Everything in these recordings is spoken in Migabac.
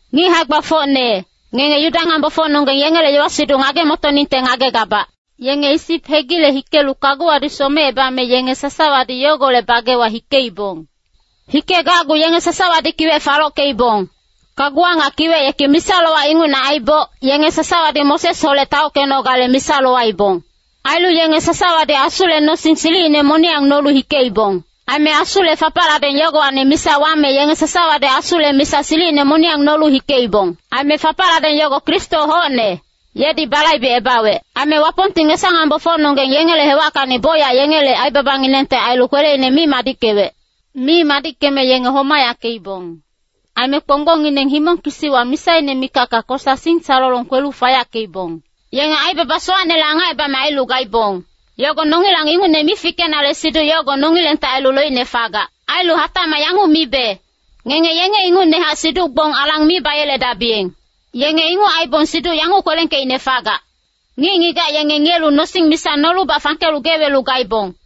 Ngic hae-gbafocne, ngenge Yuda ngambofocnonggeng yengele yowa-siduc ngage-motoningte ngagegabac. Yenge Isip hegile hikelu kaguwadi somecebame yenge sasawadi yogolec bagewa hikeibong. Hikegacgu yenge sasawadi kiwec falockeibong. Kaguwa nga kiwec yeki misa-lowac ingucne aiboc, yenge sasawadi Mosesholec taockenogale misa lowaibong. Ailu yenge sasawadi Asule nosing silicine moniyang nolu hikeibong. Aime Asule fapacladeng yogowacni misa wame yenge sasawadi Asule misa silicine moniyang nolu hikeibong. Aime fapacladeng yogo Kristo hocne, yedi balaibecebawec. Aime Wapongti ngesa-nambofocnonggeng yengele hewackacni bocyac yengele aibabanginengte ailu kweleine mi madickewec. Mi madickeme yenge homayackeibong, aime kponggbongngineng himong kisiwa misaine mikacka kosa singsalolong kwelu fayackeibong. Yenge aibaba sowacnele angacebame ailu gaibong, yogo nongilang ingucne mi fikenale siduc yogo nongilengte ailu loicne fagac. Ailu hatacmac yanguc mibe, ngenge yenge ingucnehac siduc-gbong alang mi bayeledabiyeng. Yenge inguc aibong siduc yanguc kwelengkeicne fagac, “Ngic-ngigac yenge ngiyelu nosing misa nolubac fangkelu gee welu gaibong.”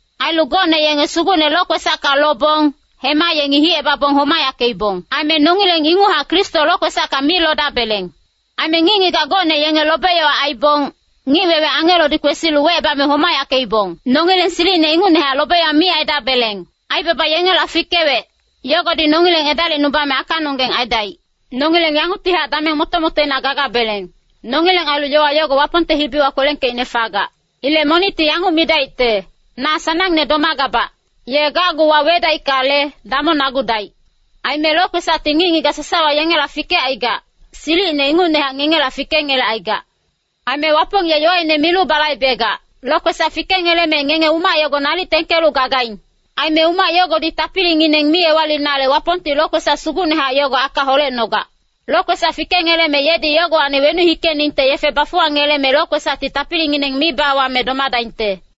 Ailu gocne yenge Sugucne lokwesacka lobong, hema yengi hicebabong homayackeibong. Aime nongileng inguchac Kristo lokwesacka mi lodabeleng. Aime ngic-ngigac gocne yenge lobe-yowa aibong, ngic-wewe angelodi kwesilu wecebame homayackeibong. Nongileng silicine ingucnehac lobe-yowa mi aidabeleng. Aibaba yengela fikewec, yogodi nongileng edalicnubame akanonggeng aidaic. Nongileng yanguctihac dameng moto-motoina gagabeleng, nongileng ailu yowa yogo Wapongte hibiwa kwelengkeicne fagac. Ilec monicti yanguc midaicte, “Na sanangne domagabac.” Ye gacgu wawedaickale, damongnagudaic. Aime lokwesacti ngic-ngigac sasawa yengela fikecaigac, silicine ingucnehac ngengela fikengelecaigac. Aime Wapong ye yowaine milu balaibegac. Lokwesac fikengeleme ngenge umac yogo nalic tengkelu gagaing. Aime umac yogodi tapilingineng mi ewalinale Wapongti lokwesac sugucnehac yogo aka holecnogac. Lokwesac fikengeleme yedi yogowacni wenuc hikeningte yefe bafuwangeleme lokwesacti tapilingineng mi bawame domadaingte.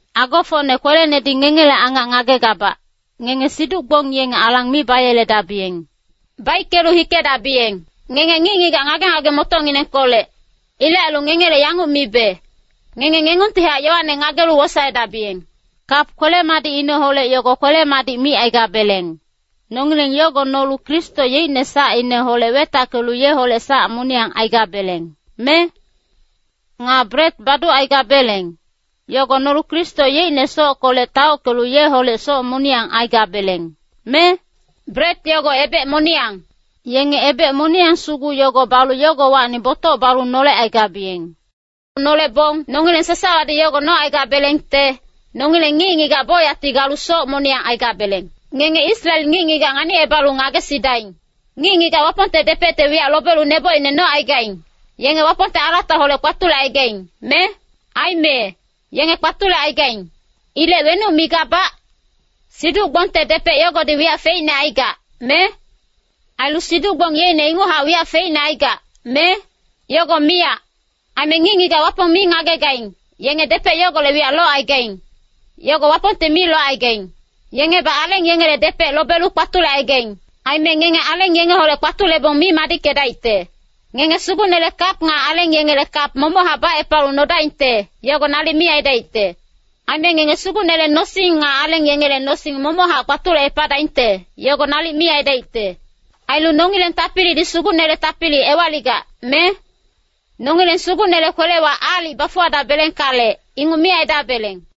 Agofocne kwelenedi ngengele angac ngagegabac, ngenge siduc-gbong yenge alang mi bayeledabiyeng. Baickelu hikedabiyeng. Ngenge ngic-ngigac ngage-ngage-motocnginengkolec. Ilec ailu ngengele yanguc mibe, ngenge ngengungtihac yowane ngagelu wosaedabiyeng. Kap kwele-madicineholec yogo kwele-madic micaigabeleng, nongileng yogo nolu Kristo yeicne sacineholec wetackelu yeholec sac moniyang aigabeleng, me? Nga bret baducaigabeleng, yogo nolu Kristo yeicne sockolec taockelu yeholec soc moniyang aigabeleng, me? Bret yogo ebec moniyang. Yenge ebec moniyang sugu yogo balu yogowacni botoc balu nolecaigabiyeng. Nolebong nongileng sasawadi yogo nocaigabelengte, nongileng ngic-ngigac bocyacti galu soc moniyang aigabeleng. Ngenge Israel ngic-ngigac nganicebalu ngagesidaing. Ngic-ngigac Wapongte depecte wiyac lobelu nebocine nocaigaing, yenge Wapongte alataholec kpatulecaigaing, me? Aime, yenge kpatulecaigaing. Ilec wenuc migabac? Siduc-gbongte depec yogodi wiyac feicne aigac, me? Ailu siduc-gbong yeicne inguchac wiyac feicne aigac, me? Yogo miyac! Aime ngic-ngigac Wapong mi ngagegaing, yenge depec yogolec wiyac locaigaing, yogo Wapongte mi locaigaing. Yengebac aleng yengele depec lobelu kpatulecaigaing. Aime ngenge aleng yengeholec kpatulebong mi madickedaicte. Ngenge Sugucnele kap nga aleng yengele kap momochac bacepalu nodaingte, yogo nalic mi aidaicte. Aime ngenge Sugucnele nosing nga aleng yengele nosing momochac kpatulecepadaingte, yogo nalic mi aidaicte. Ailu nongileng tapilidi Sugucnele tapili ewaligac, me? Nongileng Sugucnele kwelewa aalic bafuwadabelengkale, inguc mi aidabeleng.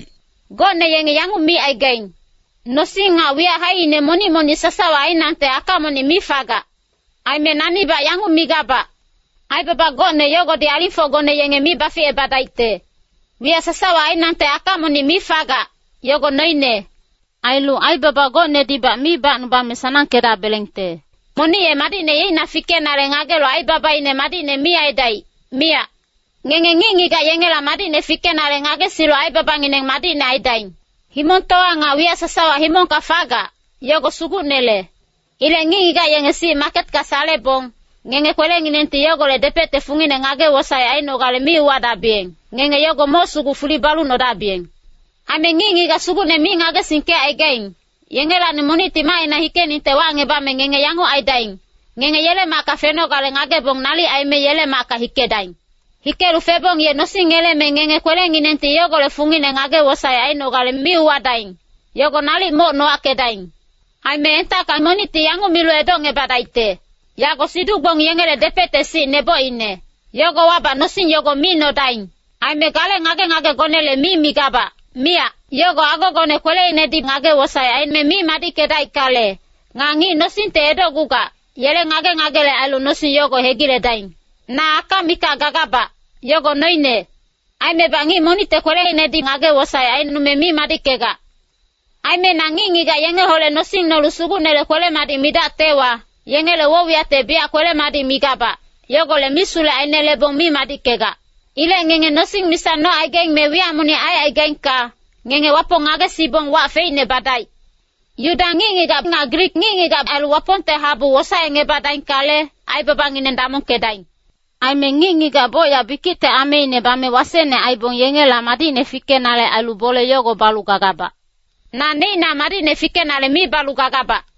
Gocne yengi yanguc micaigaing, “Nosing nga wiyac haicine monic-monic sasawa ainangte aka monic mi fagac.” Aime nanibac yanguc migabac, “Aibaba gocne yogodi alingfocgone yenge mi baficebadaicte. Wiyac sasawa ainangte aka monic mi fagac, yogo noine. Ailu aibaba gocnedibac mi bacnubame sanangkedabelengte.” Monic ye madicne yeicna fikenale ngagelu aibabaine madicne mi aidaic, miyac. Ngenge ngic-ngigac yengela madicne fikenale ngagesilu aibabangineng madicne aidaing. “Himongtowa nga wiyac sasawa himongka fagac, yogo Sugucnele.” Ilec ngic-ngigac yenge sic maketka salebong, ngenge kwelenginengti yogolec depecte fungine ngage-wosaec ainogale mi uwadabiyeng, ngenge yogo moc sugu fuli balu nodabiyeng. Aime ngic-ngigac Sugucne mi ngagesingkecaigaing, yengelacni monicti macina hikeningte wacngebame ngenge yanguc aidaing. Ngenge yele macka fenogale ngagebong nalic aime yele macka hikedaing. Hikelu febong ye nosing ngeleme ngenge kwelenginengti yogolec fungine ngage-wosaec ainogale mi uwadaing, yogo nalic moc nowackedaing. Aime entacka monicti yanguc milu edocngebadaicte, “Yago siduc-gbong yengele depecte sic nebocine.” Yogowabac nosing yogo mi nodaing. Aime gale ngage-ngagegonele mi migabac, miyac. Yogo agogone kweleinedi ngage-wosaec aime mi madickedaickale, nga ngic nosingte edocgugac, yele ngage-ngagele ailu nosing yogo hegiledaing. Na aka mikac gagabac, yogo noine. Aimebac ngic monicte kweleinedi ngage-wosaec aicnome mi madickegac. Aime na ngic-ngigac yengeholec nosing nolu Sugucnele kwele-madic midactewa, yengele woc-wiyacte biyac kwele-madic migabac, yogolec misulec ainelebong mi madickegac. Ilec ngenge nosing misa nocaigaing me wiyac monic aicaigaingka, ngenge Wapong ngagesibong wac feicne badaic. Yuda ngic-ngigac nga Grik ngic-ngigac ailu Wapongte habu wosaecngebadaingkale, aibabangineng damongkedaing. Aime ngic-ngigac bocyac bikicte ameine bame wasecne aibong yengela madicne fikenale ailu bole yogo balu gagabac. Na neicna madicne fikenale mi balu gagabac.